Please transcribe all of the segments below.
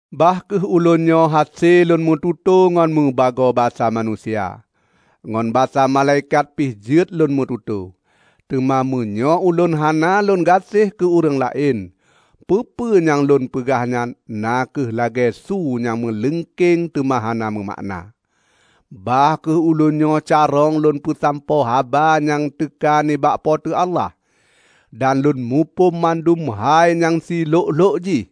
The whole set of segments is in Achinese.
Bah kheueh ulôn nyoe hase lôn meututoe ngon meubagoe basa manusia, ngon basa malaikat pih jeuet lôn meututoe, teuma meunyoe ulôn hana lôn gaséh keu ureuëng laén, peue-peue nyang lôn peugah nyan na kheueh lagée su nyang meuleungkeng teuma hana meumakna. Bah kheueh ulôn nyoe carông lôn peusampoe haba nyang teuka nibak Po teu Allah, dan lôn muphom mandum hai nyang silhok-lhok jih,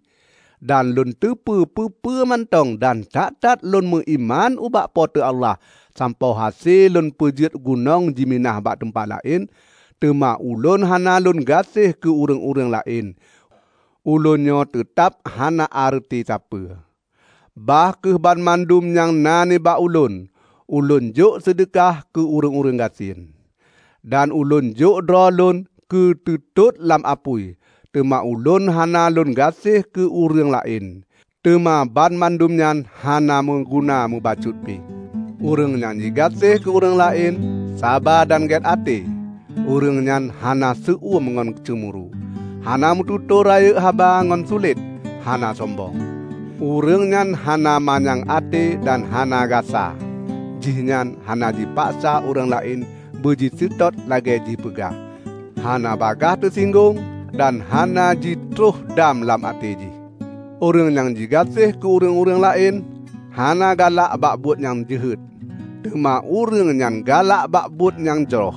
dan lôn teupeu peue-peue mantong dan that-that lôn meuiman ubak Po teu Allah sampoe hase lôn peujeuet gunong jiminah bak teumpat laén, teuma ulôn hana lôn gaséh keu ureuëng-ureuëng laén, ulôn nyoe teutab hana areuti sapeue! Bah kheueh banmandum nyang na nibak ulôn, ulôn jok seudeukah keu ureuëng gasien, dan ulôn jok droe lôn keu teutot lam apui, teuma ulôn hana lôn gas`eh keu ureuëng la`en, teuma banmandum nyan hana meuguna mubacut pi. Ureuëng nyang jigaséh keu ureuëng laén, saba dan gét até. Ureuëng nyan hana seu-eum ngon ceumuru, hana meututoe rayeuk haba ngon sulet, hana sombong. Ureuëng nyan hana manyang até dan hana gasa, jihnyan hana jipaksa ureuëng laén beuji seutôt lagée jih peugah, hana bagaih teusinggong, dan hana jitroh dam lam até jih. Ureuëng nyang jigaséh keu ureuëng-ureuëng laén, hana galak bak buet nyang jeuhet, teuma ureuëng nyan galak bak buet nyang jroh.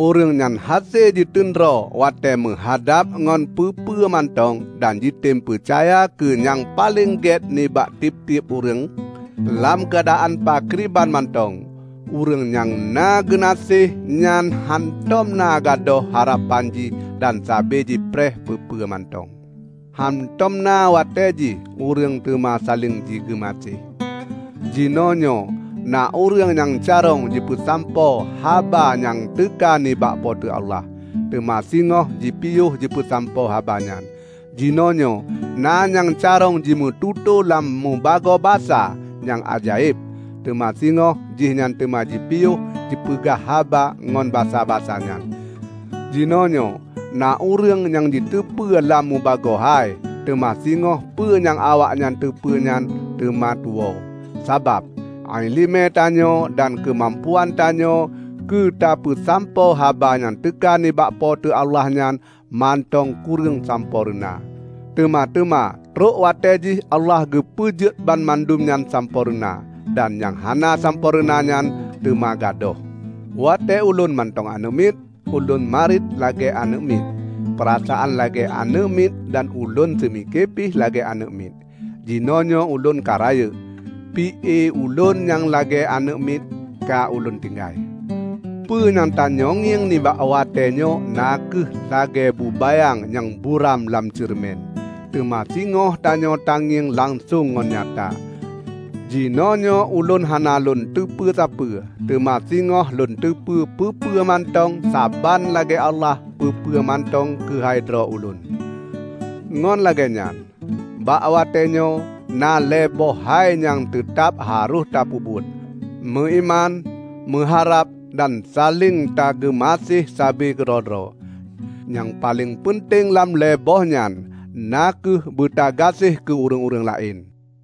Ureuëng nyan hase jiteundroe watée meuhadab ngon peue-peue mantong dan jitem peucaya keu nyang paleng gét nibak tieb-tieb ureuëng; lam keuadaan pakriban mantong ureuëng nyang na geunaséh nyan hántom na gadôh harapan jih dan saba jipreh peue-peue mantong. Hántom na watée jih ureuëng teuma saléng jigeumaséh. Jinoenyoe na ureuëng nyang carông jipeusampoe haba nyang teuka nibak Po teu Allah, teuma singoh jipiôh jipeusampoe haba nyan. Jinoenyoe na nyang carông jimeututoe lam meubagoe basa nyang ajaéb, teuma singoh jihnyan teuma jipiôh peugah haba ngon basa-basa nyan. Jinoenyoe na ureuëng nyang jiteupeu lam mubagoe hai, teuma singoh peue nyang awaknyan teupeue nyan teuma tuwoe. Sabab, iéleumé tanyoe dan keumampuan tanyoe keu tapeusampoe haba nyang teuka nibak Po teu Allah nyan, mantong kureueng sampoereuna. Teuma teuma trok watée jih Allah geupeujeuet banmandum nyan sampoereuna, dan nyang hana sampoereuna nyan teuma gadôh. Watée ulôn mantong aneuëk miet, ulôn mariet lagée aneuëk miet, peurasaan lagée aneuëk miet dan ulôn seumike pih lagée aneuëk miet. Jinoenyoe ulôn ka rayeuk, pi-e ulôn nyang lagée aneuëk miet ka ulôn tinggai. Peue nyang tanyoe ngieng nibak watée nyoe na kheueh lagée bubayang nyang buram lam ceureumen. Teuma singoh tanyoe tangieng langsong ngon nyata. Jinoenyoe ulôn hana lôn teupeu sapeue, teuma singoh lôn teupeu peue-peue mantong saban lagée Allah peue-peue mantong keuhai droe ulôn. Ngon lagée nyan, bak watée nyoe na lhée boh hai nyang teutab harôh tapeubuet: meuiman, meuharab dan saléng tameugaséh sabe keudroe-droe. Nyang paleng peunteng lam lhée boh nyan na kheueh beutagaséh kheueh keu ureuëng-ureuëng laén.